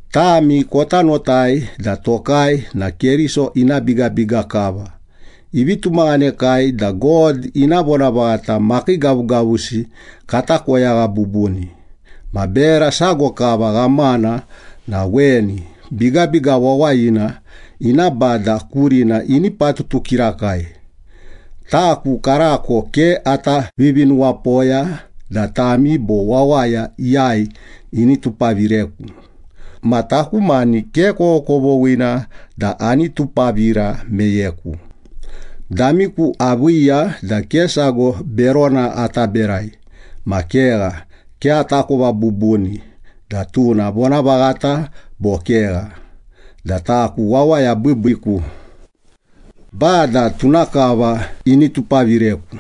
Tami kota notai da tokai na Keriso ina bigabiga kava, ivi tumaghanekai da God ina vonavaghata makii gavugavusi kata koyagha bubuni. Ma bera sago kava ghamana na weni, bigabiga wawayina ina bada kurina ini patutu kirakai. Taku karako ke ata vivinuwapoya da tami bo wawaya iyai ini tupavireku. Ma taku mani ke kovokovoghina da ani tupavira meyeku. Damiku aviiya da ke sago berona ata berai. Ma kegha, ke atakova bubuni da tuna vonavaghata bo kegha da taku wawaya biibiiku. Bada tuna kava ini tupavireku.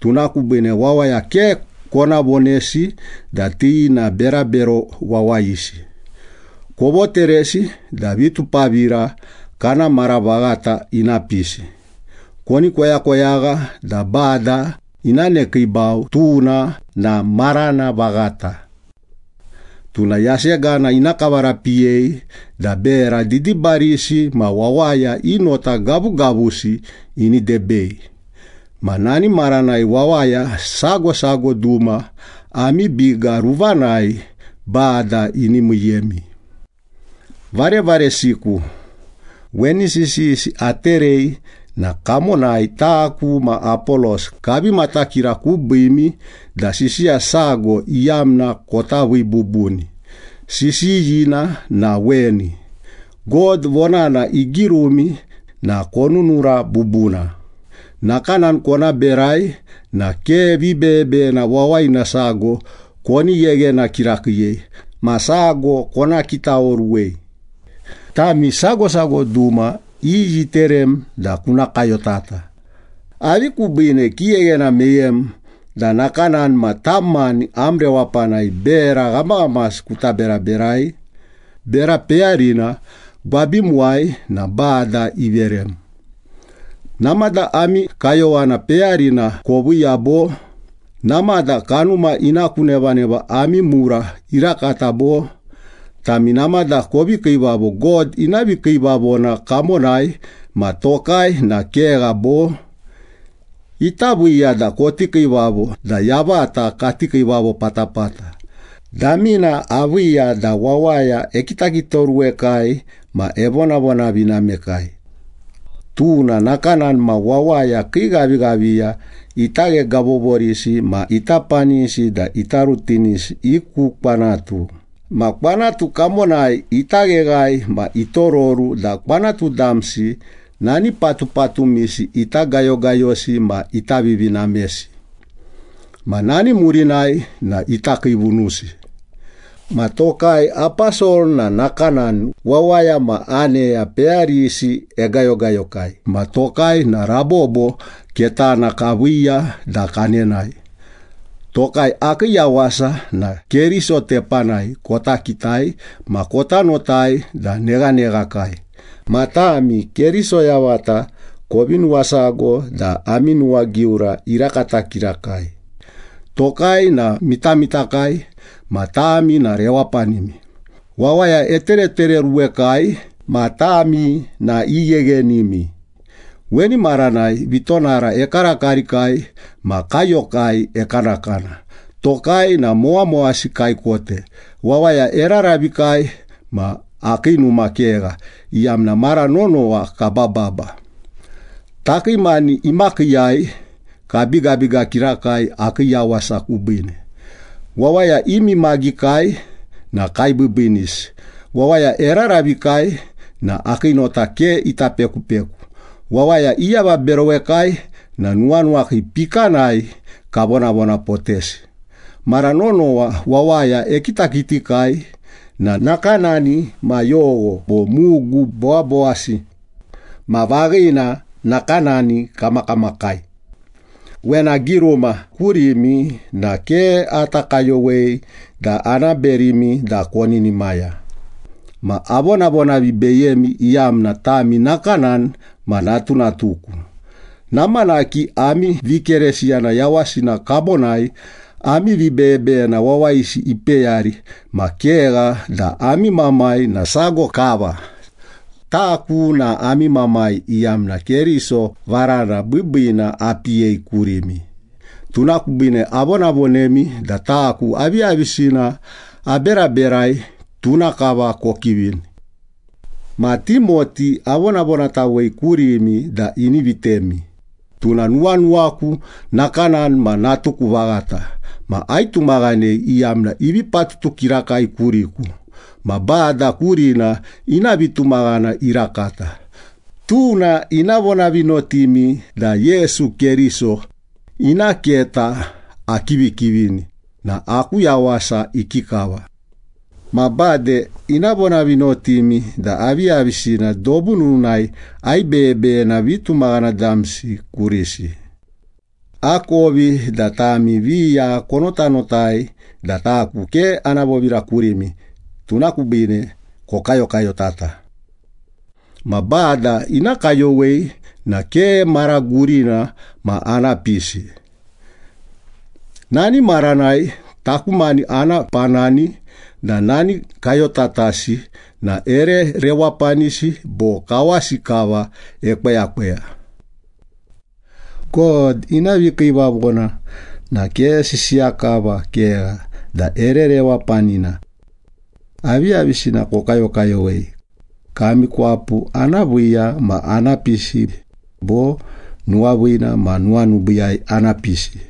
Tuna kubiine wawaya ke kona vonesi da ti na berabero wawayisi. Kovoteresi da vitupavira kana mara vaghata ina pisi. Koni koyakoyagha da Bada ina nekiibau, tuna na marana vaghata. Tuna yasegana ina kavarapiyei da bera didibarisi ma wawaya i nota gavugavusi ini debei. Ma nani maranai wawaya sago sago duma ami biga ruvanai Bada ini miiyemi. Varevaresiku, weni sisiyisi aterei na kamonai taku ma Apolos kavi matakira kubiimi da sisiya sago iyamna kota vii bubuni, sisiyina na weni, “God vonana igirumi na konunura bubuna.” Nakanani kona berai na ke vibeyebeyena wawayina sago koni gheghena kirakiiyei ma sago kona kitaoruwei. Tami sago sago duma iyi iterem da kuna kayotata? Avi kubiine kigheghena meyem da nakanani ma tam mani am rewapanai bera ghamaghamasi kuta beraberai? Bera peyarina gwabimuwai na Bada iverem. Namada ami kayowana peyarina koviiya bo? Namada kanuma ina ku nevaneva ami mura irakata bo? Tami namada kovi kiivavo God ina vikiivavona kamonai ma tokai na kegha bo? Ita viiya da koti kiivavo da yavata kati kiivavo patapata. Damina aviiya da wawaya ekitakitaoruwekai ma evonavonavinamekai. Tuna nakanani ma wawaya kii ghavighaviya ita ghegavovorisi ma ita panisi da ita rutinisi i ku kwanatu. Ma kwanatu kamonai ita gheghae ma itororu da kwanatu damsi nani patupatumisi ita gayogayosi ma ita vivinamesi. Ma nani murinai na ita kiivunusi. Ma tokai aposol na nakanani, wawaya ma aneya peyarisi egayogayokai ma tokai na rabobo ketana kaviiya da kanenae. Tokai akii yawasa na Keriso tepanai kota kitai ma kota notai da neghaneghakai. Ma tami Keriso yavata kovi nuwasago da ami nuwagiura irakata kirakai. Tokai na mitamitakai ma tami na rewapanimi. Wawaya eteretereoruwekai ma tami na igheghenimi. Weni maranai vitonara ekarakarikai ma kaiyokai ekanakana, tokai na mowamowasi kaikote, wawaya eraravikai, ma akii numa kegha, iyamna mara nonowa kabababa. Takii mani imakiiyai kabigabiga kirakai, akii yawasa kubiine. Wawaya imimagikai na kaibiibiinisi. Wawaya eraravikai na akii nota ke ita pekupeku. Wawaya iavaberowekai na nuwanuwakai pikanai kavonavonapotesi. Mara nonowa wawaya ekitakitikai na nakanani ma yogho bo mugu bowabowasi. Ma vaghina, nakanani kamakamakai. Wena agiruma kurimi na ke ata kayowei da ana berimi da koninimaya. Ma avonavonavibeyemi iyamna tami nakanani ma natunatuku. Namanaki ami vikeresiyana yawasina kamonai ami vibeyebeyena wawayisi ipeyari, ma kegha da ami mamai na sago kava. Taku na ami mamai, iyamna Keriso varana biibiina apiyei kurimi. Tuna kubiine avonavonemi da taku aviyavisina aberaberai, tuna kava kokivini. Ma Timoti avonavonatawei kurimi da ini vitemi. Tuna nuwanuwaku, nakanani ma natuku vaghata. Ma aitumaghanei, iyamna ivi patutu kirakai kuriku ma Bada kurina ina vitumaghana irakata. Tuna ina vonavinotimi da Yesu Keriso ina keta akivikivini na aku yawasa ikikava. Ma bade ina vonavinotimi da aviyavisina dobu nununai aibeyebeyena vitumaghana damsi kurisi. Akovi da tami viya konotanotai da taku ke ana vovira kurimi, tuna kubiine kokayokayotata. Ma Bada ina kayowei na ke mara gurina ma ana pisi. Nani maranai taku mani ana panani da nani kayotatasi na ere rewapanisi bo kawasi kava ekweyakweya. God ina vikiivavona na ke sisiya kava, kegha da ere rewapanina. Aviyavisina kokayokayowei? Kami kwapu ana viiya ma ana pisi bo, nuwaviina ma nuwanubiiyai ana pisi?